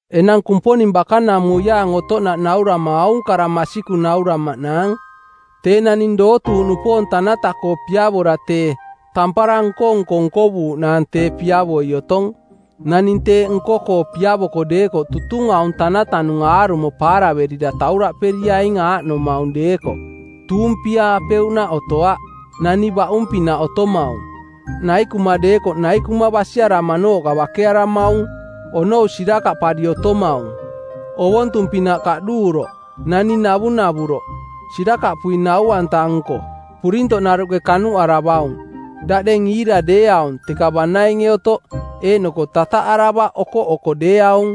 Enang Kumponing bakanamuiaang otoꞌnaꞌ naurama aung kara masikung nauramaꞌnaang: Tee naning dootuuꞌnupoong tanata-koo piavora tee, tampara nko-nko nkovuuꞌnaang tee piavoi otong. Naning teeꞌ nko-koo piavoko deekoꞌ tutung aung tanatanung aarumo paaraverira tauraꞌperiaing aaꞌnomaung deekoꞌ: Tuumpiaa-peuꞌnaꞌ otoaꞌ, nani baꞌung-pinaꞌ otomaung, naikuma deekoꞌ naikuma basiaramanooꞌka bakearamaung, onou sirakaꞌpari otomaung, ovontung-pinaꞌ kaꞌduuroꞌ, naning navunavuroꞌ, sirakaꞌpui nau-anta-nko, purintoꞌnaruꞌke kanuꞌaravaung, daꞌdeng iira deeaung teka banainge otoꞌ, eeꞌnoko tataꞌaravaꞌ okoꞌoko deeaung.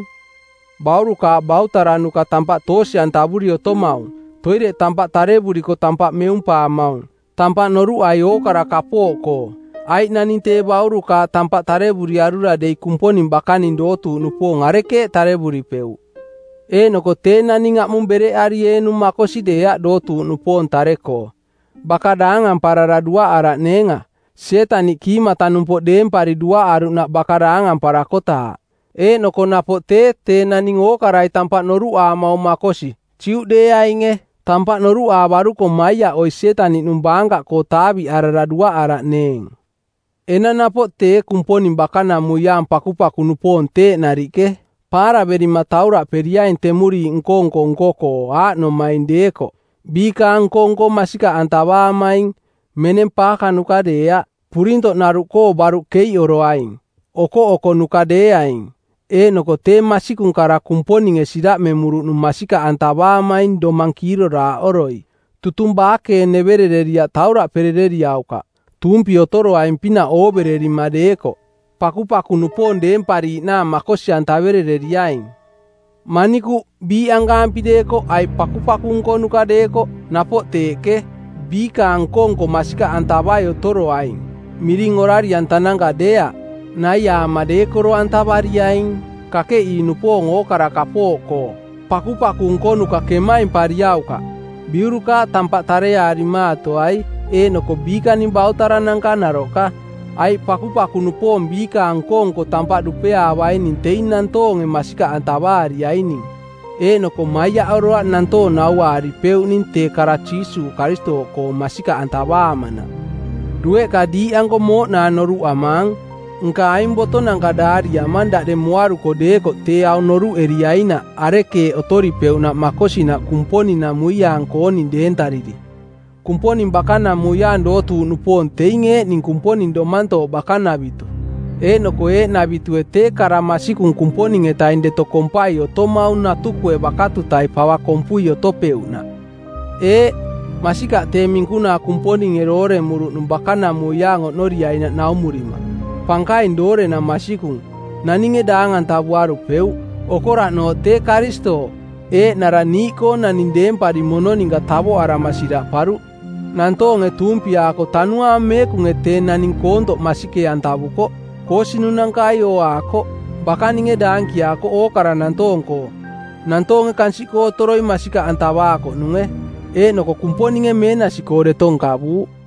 Baurukaaꞌ bautaranuka tampaꞌ toosi-antavuri otomaung, toireꞌ tampaꞌ tarevuriko tampaꞌ meumpaamaung, tampaꞌ noruꞌai ookara kapooꞌkoo. Aiꞌ naning tee baurukaaꞌ tampaꞌ tarevuriarura dei Kumponing bakaning dootuuꞌ nupoong arekeeꞌ tarevuripeuꞌ? Eeꞌnoko tee naning aꞌmung bereꞌarieenung makosi deeaꞌ dootuuꞌnupoong tare-koo. Baka daangamparara duaꞌaraꞌneenga, Sietaniꞌ kiimata-numpoꞌ deempari duaꞌaruꞌnaꞌ baka daangamparakotaaꞌ. Eeꞌnoko napoꞌ tee, tee naning ookarai tampaꞌ noruꞌaamaung makosi, Juꞌdeeainge. Tampaꞌ noruꞌaavaruko maiaꞌoi Sietaniꞌnung baankaꞌkoo taaviꞌarara duaꞌaraꞌneeng. Enang napoꞌ tee Kumponing bakanamuiaang pakupaku-nupoong teeꞌ nariꞌke, paaraverima tauraꞌperiaing temuriiꞌ nko-nko nko-koo, aaꞌnomaing deekoꞌ: Biikaang nko-nko masikaꞌantavaamaing, meneng paakanuka deeaꞌ, purintoꞌnaruꞌkoo baruꞌ keiꞌoroaing, okoꞌokonuka deeaing, eeꞌnoko tee masikung kara Kumponinge siraꞌmemuruꞌnung masikaꞌantavaamaing domang kiiroraaꞌoroi. Tutung baakeeneverereriaꞌ tauraꞌperereriaukaꞌ. Tuumpi otoroaing-pinaꞌ oovererima deekoꞌ, pakupaku-nupoong deempariiꞌnaang makosi-antaverereriaing. Manikuꞌ, biiꞌankaampi deekoꞌ aiꞌ pakupaku nkonuka deekoꞌ, napoꞌ teeꞌke, biikaang nko-nko masikaꞌantavai otoroaing, miring orari-antananka deeaꞌ, naiaama deekoro-antavariaing, kakeꞌii-nupoong ookara kapooꞌkoo. Pakupaku nkonuka kemaimpariaukaꞌ. Biurukaaꞌ tampaꞌ tareaarimaatoai eeꞌnoko biikaning bautarananka naroꞌka. Aiꞌ pakupaku-nupoong biikaang nko-nko tampaꞌ dupeaavaining teing nantoonge masikaꞌantavaariaining, eeꞌnoko maiaꞌoroaꞌ nantoong nauaaripeuꞌning tee kara Jiisuuꞌ Karistooꞌkoong masikaꞌantavaamanaꞌ. Dueꞌka diiꞌanko mooꞌnaang noruꞌamaang, nka aing botonanka daariamang daꞌdeng moaruko deekoꞌ tee aung noruꞌeriainaꞌ arekeeꞌ otoripeuꞌnaꞌ makosinaꞌ Kumponing-namuiaang-kooning deentariri. Kumponing bakanamuiaang dootuuꞌnupoong teing eeꞌning Kumponing Domantooꞌ bakanavitu. Eeꞌnoko eeꞌnavitue tee kara masikung Kumponing-etaing deto kompai otomaung natukue bakatutai pava kompui otopeuꞌnaꞌ. Eeꞌ, masikaꞌ tee minkunaa Kumponinge dooremuruꞌnung bakanamuiaang oꞌnoriainaꞌ naumurima, pankaing doorenang masikung, naninge daang-antavuarupeuꞌ. Okoraꞌnooꞌ tee Karistooꞌ, Eeꞌnara niiꞌkoong naning deempari mono ninka tavoꞌarama siraꞌparuꞌ; Nantoonge tuumpiaako Tanuaang Meekunge tee naning koontoꞌ masikee-antavukoꞌ; Koosinunankai ooaakoꞌ; Bakaninge daankiaakoꞌ ookara nantoong-koo; Nantoonge kansiꞌkoo otoroi masikaꞌantavaakoꞌnunge; Eeꞌnoko Kumponinge meenasi-koo deto nkavuuꞌ.